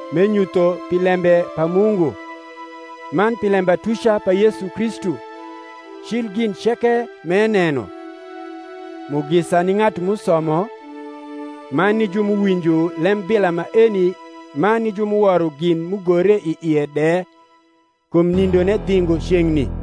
m’enyutho pi lembe pa Mungu, man pi lembatuca pa Yesu Kristu, cil gin ceke m’eneno. Mugisa ni ng’atu m’usomo, man ni ju m’uwinjo lembila maeni man ni ju m’uworo gin m’ugore i ie de: kum nindone dhingo ceng’ni.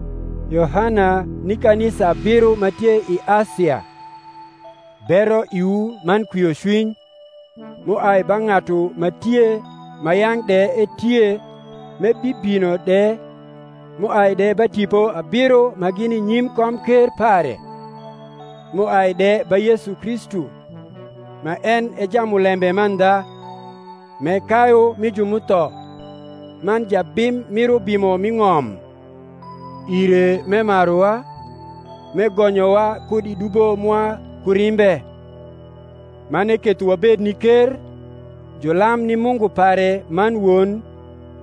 Yohana ni kanisa abiro ma tie i Asia: Bero iwu man kwiocwiny, m’uai ba ng’atu ma tie ma yang’ de etie m’ebibino de: m’uai de ba Tipo abiro ma gini nyim komker pare; m’uai de ba Yesu Kristu, ma en e jamulembe mandha, m’e kayu mi ju m’utho, man jabim mir ubimo m’i ng’om. Ire m’emaruwa, m’egonyowa kud i dubo mwa ku rimbe; man eketho wabed ni ker, julam ni Mungu pare man Won;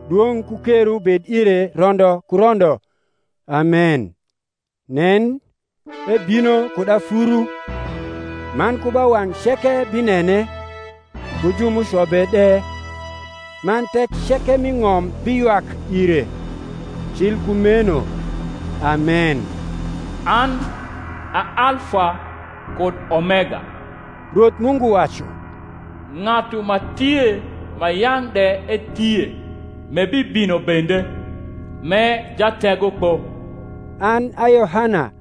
dwong’ ku kero bed ire rondo ku rondo. Amen. Nen, ebino kud afuru; man ku ba wang’ ceke binene, ku ju m’ucobe de; man thek ceke m’i ng’om biywak ire. Cil kumeno. Amen. An a Alfa kud Omega, Rwoth Mungu wacu, ng’atu ma tie ma yang’ de etie m’ebibino bende, m’e Jategokpo. An a Yohana,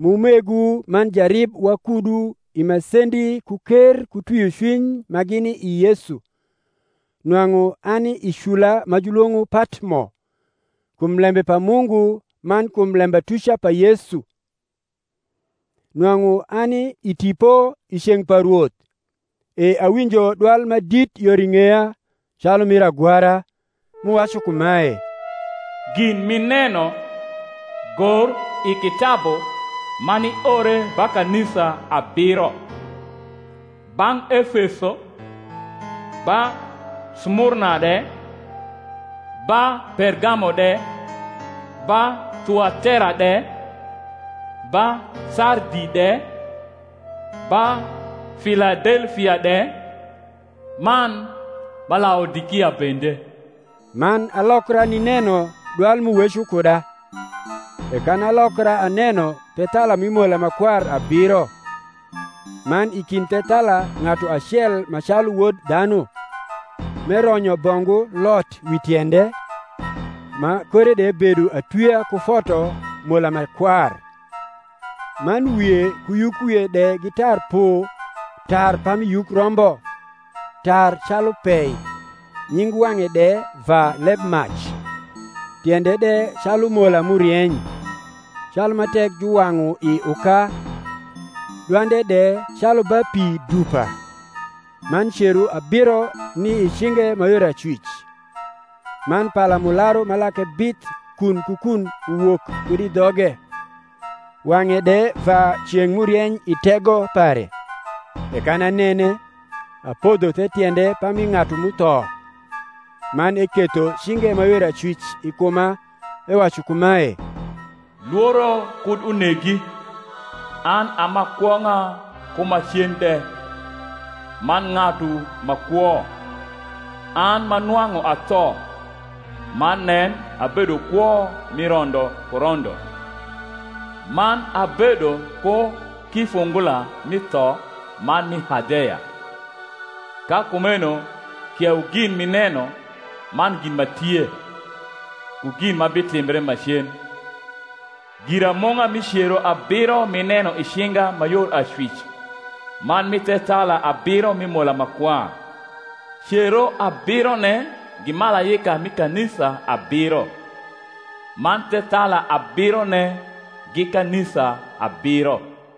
m’umegwu man jarib wakudu i masendi ku ker ku twiocwiny ma gini i Yesu, nwang’u ani i cula ma julwong’o Patmo, kum lembe pa Mungu man kum lembatuca pa Yesu. Nwang’u ani i Tipo i ceng’ pa Rwoth, e awinjo dwal ma dit yor i ng’eya, calu mir agwara, m’uwacu kumae, Gin m’ineno, gor i kitabu man iore ba kanisa abiro: bang’ Efeso, ba Smurna de, ba Pergamo de, ba Thuatera de, ba Sardi de, ba Filadehia de, man ba Laodikia bende. Man alokra nineno dwal m’uweco kuda. E kan alokra aneno thethala mi mola ma kwar abiro; man i kind thethala ng’atu acel ma calu wod dhanu, m’eronyo bongu lot wi tiende, ma kore de bedo atwia ku foto mola ma kwar. Man wie ku yukwie de gi tar pu tar pami yuk rombo, tar calu pei; nying wang’e de va lebmac; tiende de calu mola m’urieny, calu ma tek juwang’u i uka; dwande de calu ba pi dupa. Man cero abiro ni i cinge ma yor acwic: man palamularu ma lake bith kun ku kun uwok kud i dhoge: wang’e de va ceng’ m’urieny i tego pare. E kan anene, apodho the tiende pami ng’atu m’utho. Man eketho cinge ma yor acwic i kuma, ewacu kumae, Lworo kud unegi; an a ma kwong’a ku ma cen de, man ng’atu ma Kwo; an ma nwang’u atho, man nen, abedo kwo mi rondo ku rondo, man abedo ku kifungula mi tho man mi Hadeya. Ka kumeno kieu gin m’ineno man gin ma tie, ku gin ma bitimbre macen; giramung’a mi cero abiro m’ineno i cinga ma yor acwic, man mi thethala abiro mi mola ma kwar. Cero abirone gi malaika mi kanisa abiro: man thethala abirone gi kanisa abiro.